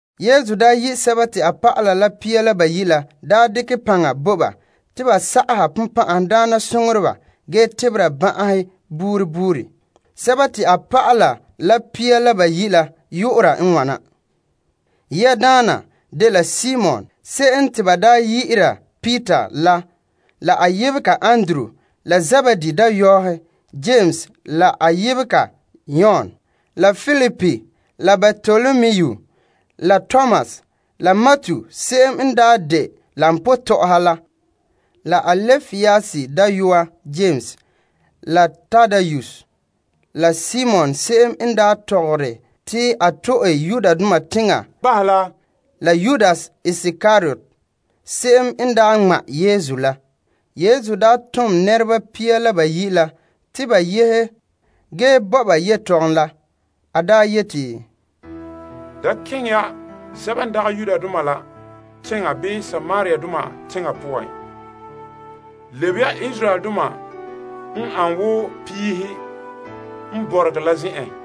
Yesu daa yi' a dɔlɔba pia la bayi' la bo paŋa te ba sa'aha bonbɛ'ɛhe ge tebera ban'ahe yema yema. Yesu tontoneba la pia la bayi' la yu'ura n wana. Yiadaana dela Simon se'em te ba daa yi'ira Peter la a yebega Andrew la Zebedee dayɔɔhe Yames la a yebega Yon la Filip la Bartolomu la Tomas la Matu n de koba tɔ'ɔha la Alpaeus dayɔa Yames la Tadaeus la Simon se'em n daa tɔgɔre te a to'e Yudoma teŋa bahɛ la Yudas Iskariot se'em n daa ŋma' Yesu la. Yesu daa tom pia la bayi' la te ba yehe, ge pa'ale ba yeti, Da keŋɛ ya sɛba n dagɛ Yudoma la teŋa bii Samariadoma teŋa poan. Ge keŋɛ ya Israeldoma n an woo piihe n bɔregɛ la teŋhe.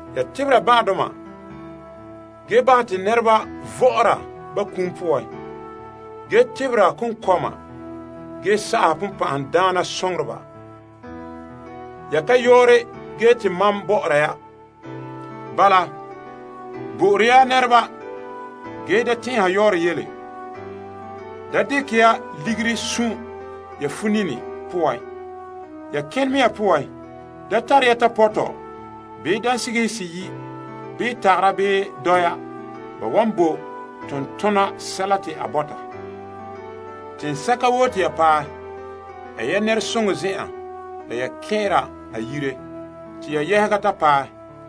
Ya tebera ban'ahedoma ge bahɛ te nɛreba vɔ'ɔra ba kum poan ge tebera konkɔma gee sa'aha bonbɛ'ɛhe. Ya ka yɔɔre ge te mam bɔ'ɔra ya. Bala, bo'ore ya nɛreba ge da tɛn'ɛha yɔɔrɛ yele. Da dekɛ ya ligiri sun' ya funini poan. Ya kenɛ mea poan, da tare ya tapɔtɔ bii dansigihe seyi' bii tagara bii dɔya. Ba wan bo tontona sɛla te a bɔta. Teŋsɛka woo te ya paɛ, ɛ ya nɛresoŋɔ zen'an la ya kɛn'ɛra a yire te ya yɛhega ta paɛ.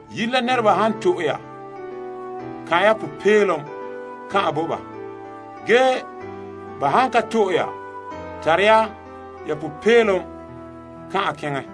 Yire la nɛreba han to'e ya bahɛ ya kan'somɔ la bo ba, ge ba han ka to'e ya, luke ya ya sunma'ahom kan'an keŋɛ.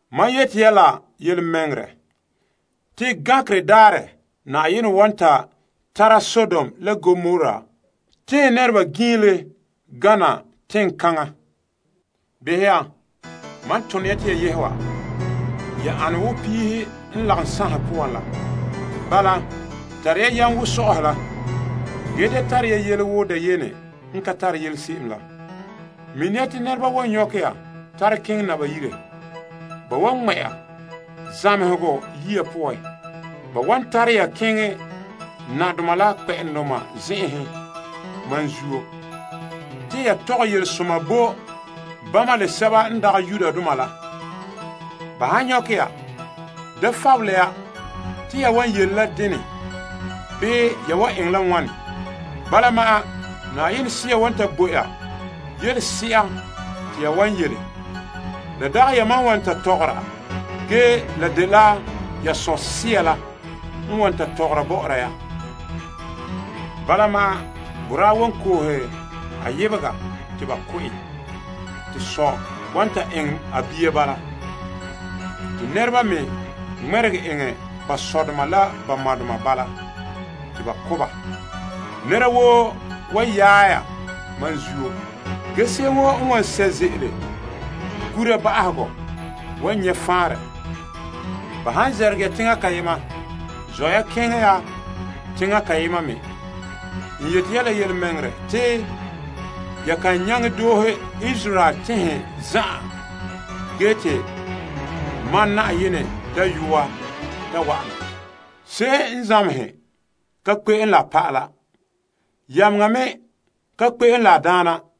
Mam yeti ya la yelemɛŋɛrɛ te gankerɛ daarɛ Yenɛ wan ta tara Sodom la Gomora teŋhe nɛreba giinle gana teŋkaŋa. Behɛ ya, mam tone ya te ya yehe wa, ya ane wo piihe n lagom sanhe poan la, bala wake ya wo bonsɛla la, ge dene ya naana wo dayene la. Mini ya te nɛreba wan nyɔkɛ ya tare naba yire, ba wan ŋmɛ' ya zamehegɔ yiya poan. Ba wan tare ya keŋɛ teŋbeheradoma la nadoma la zen'enhen mam zuo, te ya tɔgɛ yelesoma la bo bama la sɛba n dagɛ Yudoma la. Ba han nyɔkɛ ya, da fabele ya te ya wan yele la dene bii ya wan eŋɛ la wane. Bala ma'an Sea wan ta bo ya yelese'a te ya wan yele. La dagɛ yamam n wan ta tɔgɔra ge la dela ya Sɔ' Sea la n wan la tɔgɔra bɔ'ɔra ya. Bala ma'an boraa wan koohe a yebega te ba ko' en. Te sɔ wan ta eŋɛ a bia bala. Te nɛreba me ŋmɛregɛ eŋɛ ba sɔdoma la ba madoma bahɛ te ba ko' ba. Nɛra woo wan yaɛ ya mam zuo. Ge se'em woo n wan sɛ' ze'ele gura ba'ahegɔ, wan nyɛ' faanrɛ. Ba han zɛrɛgɛ ya teŋa kayema, zɔ' ya keŋɛ ya teŋa kayema me. N yeti ya la yelemɛŋɛrɛ te ya kan nyaŋɛ doohe Israel teŋhe zan'an ge te Asaala Dayɔa ta wa'ana. Se'em n zamehe ka kpe'em la a pa'ala bii yameŋa ka kpe'em la a daana.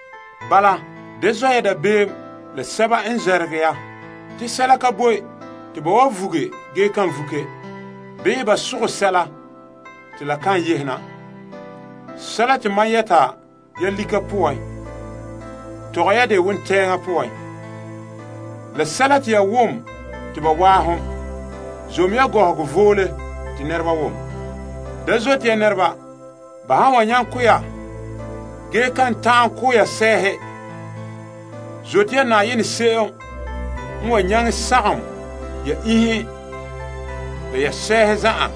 Bala, da zɔ' ya dabeem la sɛba n zɛrɛgerɛ ya. Sɛla ka boe te ba vuge ge kan vuke bii ba sogɛ sɛla te la kan yehe na. Sɛla te mam yɛta ya lika poan, tɔgɛ ya dɛ wontɛɛŋa poan. Sɛla te ya wom te ba waahom, zom ya gɔhɔgɔ voole te nɛreba wom. Da zote ya nɛreba n wan nyaŋɛ ko' ya, ge ba kan ta'an ko' ya sɛɛhe. Zote ya se'em n wan nyaŋɛ sagom ya iinhe la ya sɛɛhe zan'an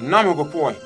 namehegɔ poan.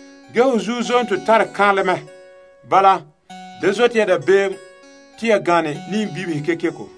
Ho zuo zonto tare kaanlɛ mɛ. Bala, da zote ya dabeem te ya gane niiŋbibihe kekeko.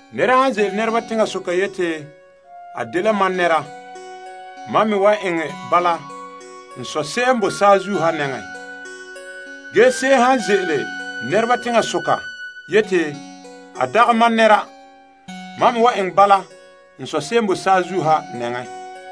Nɛra han ze'ele nɛreba teŋasoka yeti a dela mam nɛra, mam me wan eŋɛ bala n Sɔ' n boe saazuo ha nɛŋan. Ge se'em han ze'ele nɛreba teŋasoka yeti a dagɛ mam nɛra, mam me wan eŋɛ bala n Sɔ' n boe saazuo ha nɛŋan.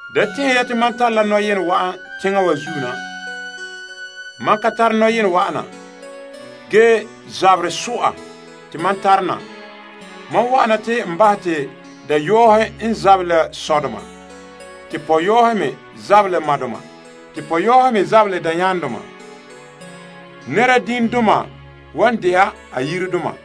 Da tɛn'ɛhe ya te mam tare la nɔyenɛ wa'an teŋa wa zuo na. Mam ka tare nɔyenɛ wa'ana ge zaberɛ so'a te mam tare na. Mam wa'ana te n bahɛ te dayɔa n zabera ka sɔ, te pugula me zabera la ka ma, te pɔka me zabera la ka dayaama. Nɛra dima dela a yiren nɛra.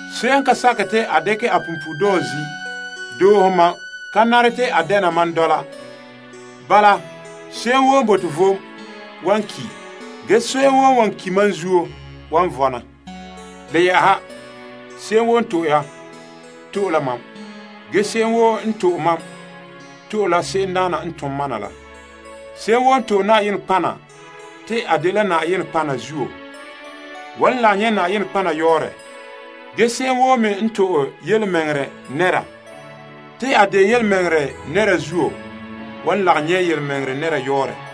Se'em n ka sakɛ te a dekɛ a punpuuredɔɔ zi' doohe mam ka nare te a dɛna mam dɔla. Bala, se'em woo n bote vom wan ki', ge se'em woo n wan ki' mam zuo, wan vɔna. Le yɛ'ɛha, se'em woo n to'e ya, to'e la mam. Ge se'em woo n to'e mam, to'e la se'emdaana n tom mam na la. Se'em woo n to'e Yenɛ nɔtɔgɔha te a de nɔtɔgɔha zuo, wan lagom nyɛ' nɔtɔgɔha yɔɔrɛ. Ge se'em woo me n to'e tontɔɔ nɛra, te a de tontɔɔ la zuo, wan lagom nyɛ' tontɔɔ nɛra yɔɔrɛ.